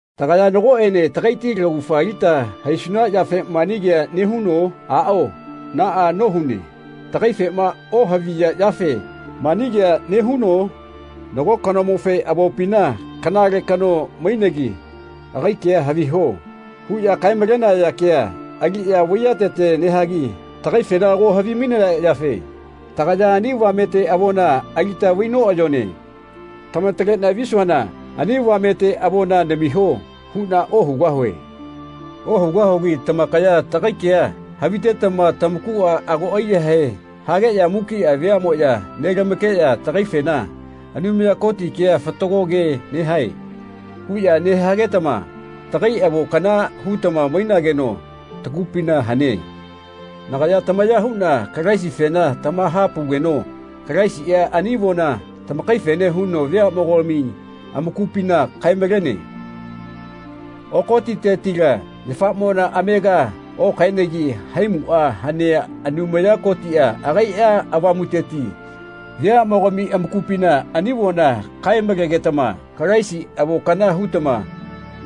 Tagaya nagoꞌene tagaiti laugafa alita haisuna yafe mani kea nehuno? Aꞌao naꞌa nohune. Tagaifema ohaviya yafe mani kea nehuno? Nago kanomofe avopina “Kanale kano mainegi agai kea haviho.” huꞌya kae-malenaya kea aliꞌya vaiyatete nehagi tagaifena ago havimainaya yafe tagaya ani avamete avona alita vai noꞌayone. Tamataleꞌna visuana “Ani avamete avona namiho.” huꞌna ohugahue. Ohugahugi tamakaya tagai kea havitetama tamakuꞌa ago aiyahae hageꞌya mukiꞌa veaꞌmoꞌya nelamakeꞌya tagaifena “Anumaya Koti kea fatago ke nehae.” huꞌya nehagetama tagai avo kana hutama mainageno tagupina hane. Nagaya tamaya huꞌna Kalaisifena tamahapaugeno Kalaisiꞌa ani avona tamakaife huno veaꞌmogami amakupina kae-malene. Oko titetila yafamona amega okaenegi haimuꞌa hanea Anumaya Kotiꞌa agaiꞌa Avamuteti veaꞌmogatami amakupina ani avona kae-malegetama Kalaisi avo kana hutama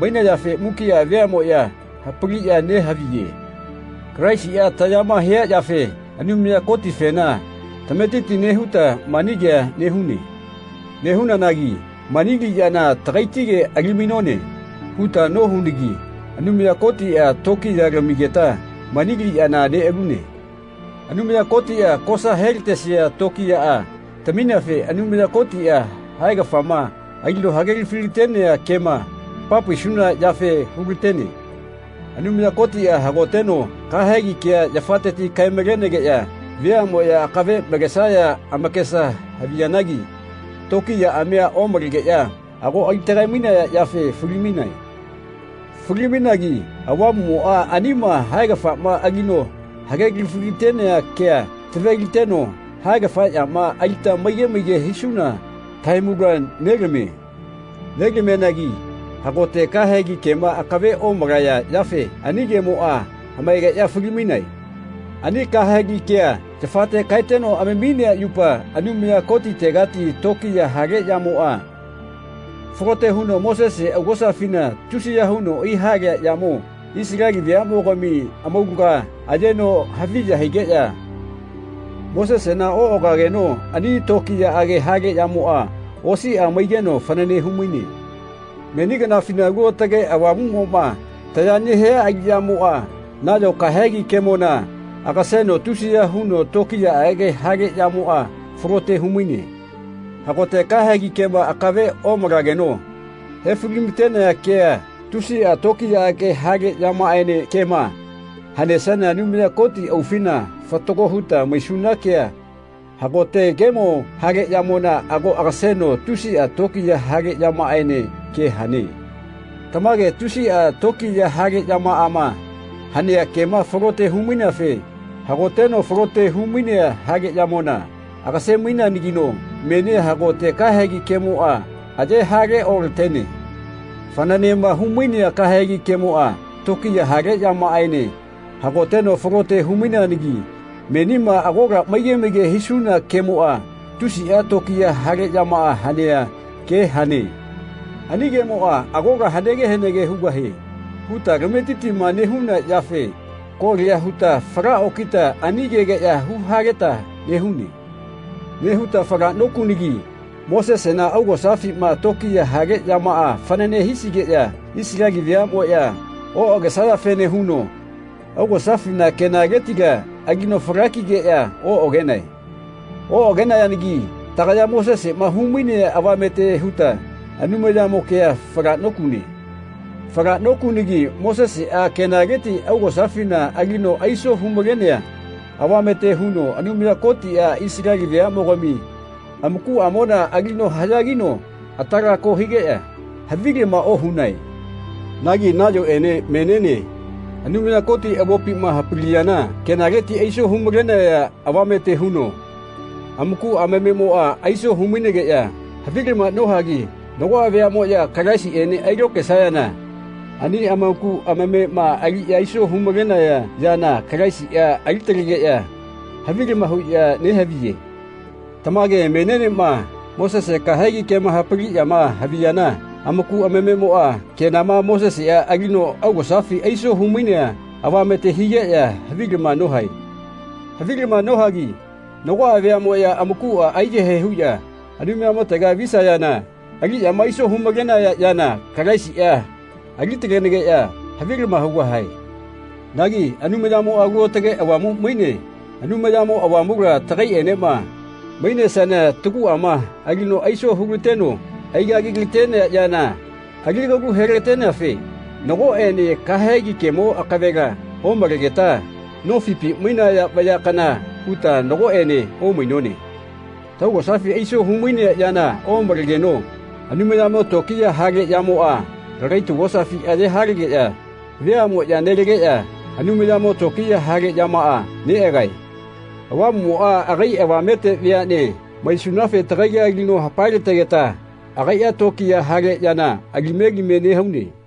mainayafe mukiꞌa veaꞌmoꞌya hapaliꞌya nehaviye. Kalaisiꞌa tayama hia yafe Anumaya Kotifena tametiti nehuta mani kea nehune. Nehunanagi “Mani aliꞌyana tagaitige alimainone” huta nohunagi Anumaya Kotiꞌa tokiya lamigeta mani aliꞌyana neꞌalune. Anumaya Kotiꞌa kosa helatesia tokiyaꞌa tamineafe Anumaya Kotiꞌa haegafama alino hagelafi-latenea kema hamapaisuna yafe hulatene. Anumaya Kotiꞌa hagoteno kahegi kea yafate kae-malenegeꞌya veaꞌmoꞌya akave malesaya amakesa haviyanagi tokiyaꞌamia omalegeꞌya ago alitagae-mainaya yafe fali-mainae. Fali-mainagi Avamuꞌmoꞌa anima haegafama alino hagelafi-latenea kea tave-liteno haegafa yama alita maige maige hisuna tahaimula nelamie. Nelamianagi hagote kahegi kema akave omalaya yafe ani kemoꞌa hamaegeꞌya fali-maine. Ani kahegi kea yafate kaeteno amaminea yupa Anumaya Kotitegati tokiya hale yamoꞌa falote huno Mosese augosafina tusiya huno aihalea yamo Isaleli veaꞌmogami amaulaga ayeno haviya higeꞌya Mosesena oꞌagageno ani tokiyaꞌage hale yamoꞌa osiꞌa maigeno fanane humaine. Meni kanafina Alu Aotage Avamuꞌmoꞌma taya nehia aliꞌyamoꞌa nayo kahegi kemona agaseno tusiya huno tokiyaꞌage hale yamoꞌa falote humaine. Hagote kahegi kema akave omalageno hefalimatenea kea tusiꞌa tokiyaꞌage hale yamaꞌaene kema hanesiana Anumaya Koti aufina fatago huta maisuna kea hagote kemo hale yamona ago agaseno tusiꞌa tokiya hale yamaꞌaene kea hane. Tamage tusiꞌa tokiya hale yamaꞌama hanea kema falote humaineafe hagoteno falote humainea hale yamona agase-maineanagino menia hagote kahegi kemoꞌa aye hale olatene. Fananema humainea kahegi kemoꞌa tokiya hale yamaꞌaene hagoteno falote humaineanagi menima agola maige maige hisuna kemoꞌa tusiꞌa tokiya hale yamaꞌa hanea ke hane. Ani kemoꞌa “Agola hanege hanege hugahie.” huta tametitima nehuna yafe kolia huta fala okita ani kegeꞌya huhaleta nehune. Nehuta falaꞌnokunagi Mosesena augosafima tokiya hale yama fanane hisigeꞌya Isaleli veaꞌmoꞌya oꞌagesayafene huno augosafina kenaletila alino fala kigeꞌya oꞌagenae. Oꞌagenayanagi tagaya Moseseꞌma humainea avamete huta Anumayamo kea fala nokune. Fala nokunagi Moseseꞌa kenaleti augosafina alino aiso humalenea avamete huno Anumaya Kotiꞌa Isaleli veaꞌmogami amakuꞌamona alino haꞌyagino atalako higeꞌya havilama ohunae. Nagi nayoꞌene meniene Anumaya Koti avopima hapaliyana kenaleti aiso humalenea avamete huno amaku amamemoꞌa aiso humainegeꞌya havilama nohagi nagoꞌa veaꞌmoꞌya Kalaisiꞌene ailokaesayana ani amaku amamema aliꞌya aiso humalenaya yana Kalaisiꞌa alitalegeꞌya havilama huꞌya nehaviye. Tamage menienema Mosese kahegi kema hapaliꞌyama haviyana amaku amamemoꞌa kenama Moseseꞌa alino augosafi aiso humainea avamete higeꞌya havilama nohae. Havilama nohagi nagoꞌa veaꞌmoꞌya amakuꞌa aiyahae huꞌya Anumayamotega visayana aliꞌyama aiso humalenaya yana Kalaisiꞌa alitalenageꞌya havilama hugahae. Nagi Anumayamoꞌa Alu Aotage Avamu maine. Anumayamo Avamula tagaiꞌenema mainesiana taguꞌama alino aiso hulateno aigagilatenea yana aligalu helateneafe nagoꞌene kahegi kemo akavela omalegeta nofipi mainaya vaya kana huta nagoꞌene omainone. Taugosafi aiso humainea yana omalegeno Anumayamo tokiya hale yamoꞌa lagai taugosafi aye halegeꞌya veaꞌmoꞌya nelageꞌya Anumayamo tokiya hale yamaꞌa neꞌagae. Avamuꞌmoꞌa agai avamete veaꞌne maisunafe tagaila alino hapae-lategeta agaiꞌa tokiya hale yana alime alime nehaune.